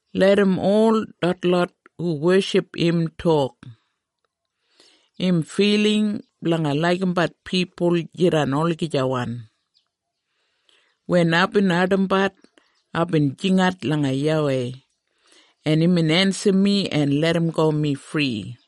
Larram ol detlot hu weship im tok, “Im filing blanga laigimbat pipul jidan olagijawan.” Wen aibin ardimbat, aibin jingat langa YAWEI, en imbin ensim mi en larramgo mi fri.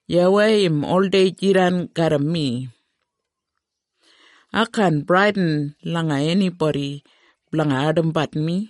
YAWEI im oldei jidan garram mi. Ai kaan bradin langa enibodi blanga ardimbat mi.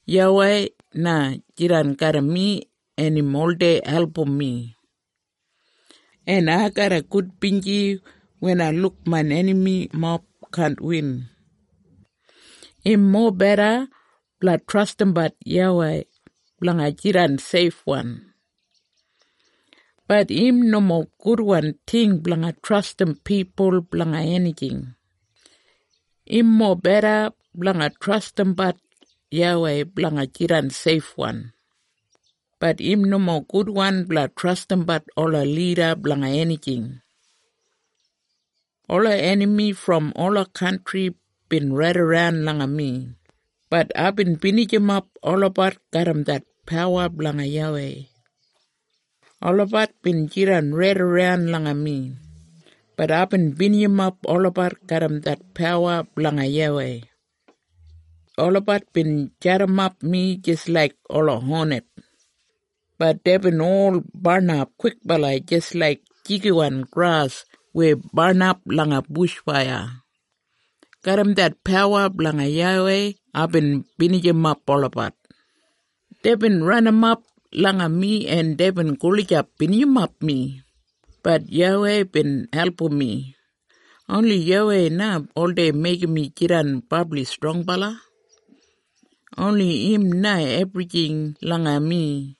YAWEI na jidan garram mi en im oldei album mi. En ai garra gudbinji wen ai luk main enamimob kaan win. Im mobeda blanga trastimbat YAWEI blanga jidan seifwan, bat im nomo gudwan ting blanga trastim pipul blanga enijing. Im mobeda blanga trastimbat YAWEI blanga jidan seifwan, bat im nomo gudwan blanga trastimbat ola lida blanga enijing. Ola enami brom ola kantri bin raidaran langa mi, bat aibin binijimap olabat garram det pawa blanga YAWEI. Olabat bin jidan raidaran langa mi, bat aibin binijimap olabat garram det pawa blanga YAWEI. Olabat bin jadimap mi jis laik ola honet, bat deibin ol barnap kwikbala jis laik jigiwan gras weya barnap langa bush faiya. Garram det pawa blanga YAWEI aibin binijimap olabat. Deibin ranimap langa mi en deibin gulijap binijimap mi, bat YAWEI bin album mi. Oni YAWEI na oldei meigim mi jidan brabli strongbala. Oni im na ebrijing langa mi.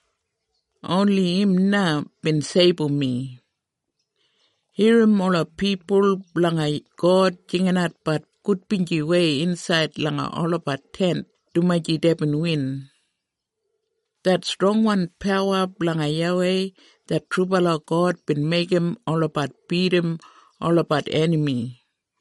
Oni im na bin seibum mi. Irrim ola pipul blanga God jinginatbat gudbinjiwei insaid langa olabat tent dumaji deibin win. Det strongwan pawa blanga YAWEI det trubala God bin meigim olabat bidim olabat enami.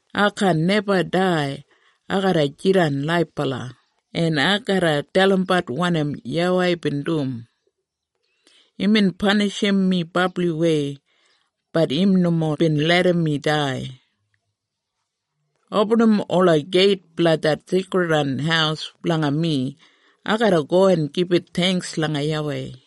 Ai kaan neba dai. Ai garra jidan laibala, en ai garra dalimbat wanim YAWEI bin dum. Imbin panishim mi brabliwei, bat im nomo bin larram mi dai. Opinim ola geit blanga det seikridwan haus blanga mi. Ai garra go en gibit theingks langa YAWEI.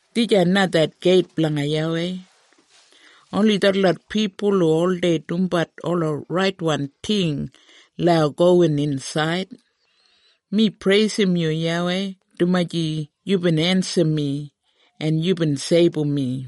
Dijan na det geit blanga YAWEI. Oni detlot pipul hu oldei dumbat ola raitwan ting lau gowin insaid. Mi preisim yu YAWEI dumaji yubin ensim mi, en yubin seibum mi.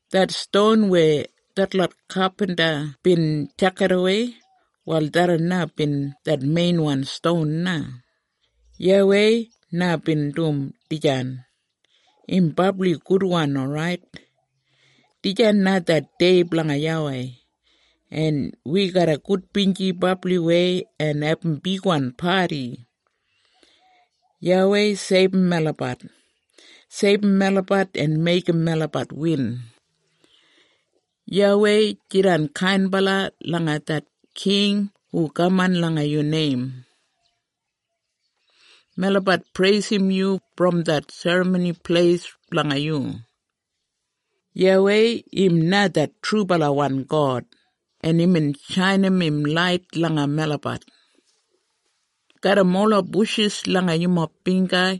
Det ston weya detlot kapinta bin tjakidawei, wal tharran bin det meinwan ston na. YAWEI na bin dum dijan. Im brabli gudwan orait. Dijan na det dei blanga YAWEI, en wi garra gudbinji brabliwei en abum bigwan padi. YAWEI, seibum melabat. Seibum melabat en meigim melabat win. YAWEI, jidan kainbala langa det king hu kaman langa yu neim. Melabat preisim yu brom det Serramoni Pleis blanga yu. YAWEI im na det trubalawan God, en imbin shainim im lait langa melabat. Garram ola bushis langa yumob bingga,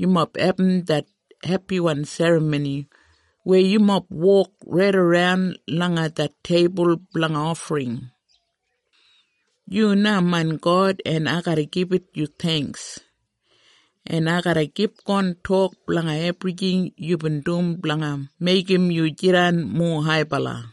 yumob abum det hepiwan serramoni weya yumob wok raidaran langa det teibul blanga ofring. Yu na main God en ai garra gibit yu theingks, en ai garra kipgon tok blanga ebrijing yubin dum blanga meigim yu jidan mowa haibala.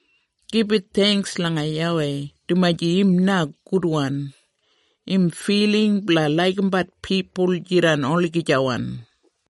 Gibit theingks langa YAWEI dumaji im na gudwan. Im filing blanga laigimbat pipul jidan olagijawan.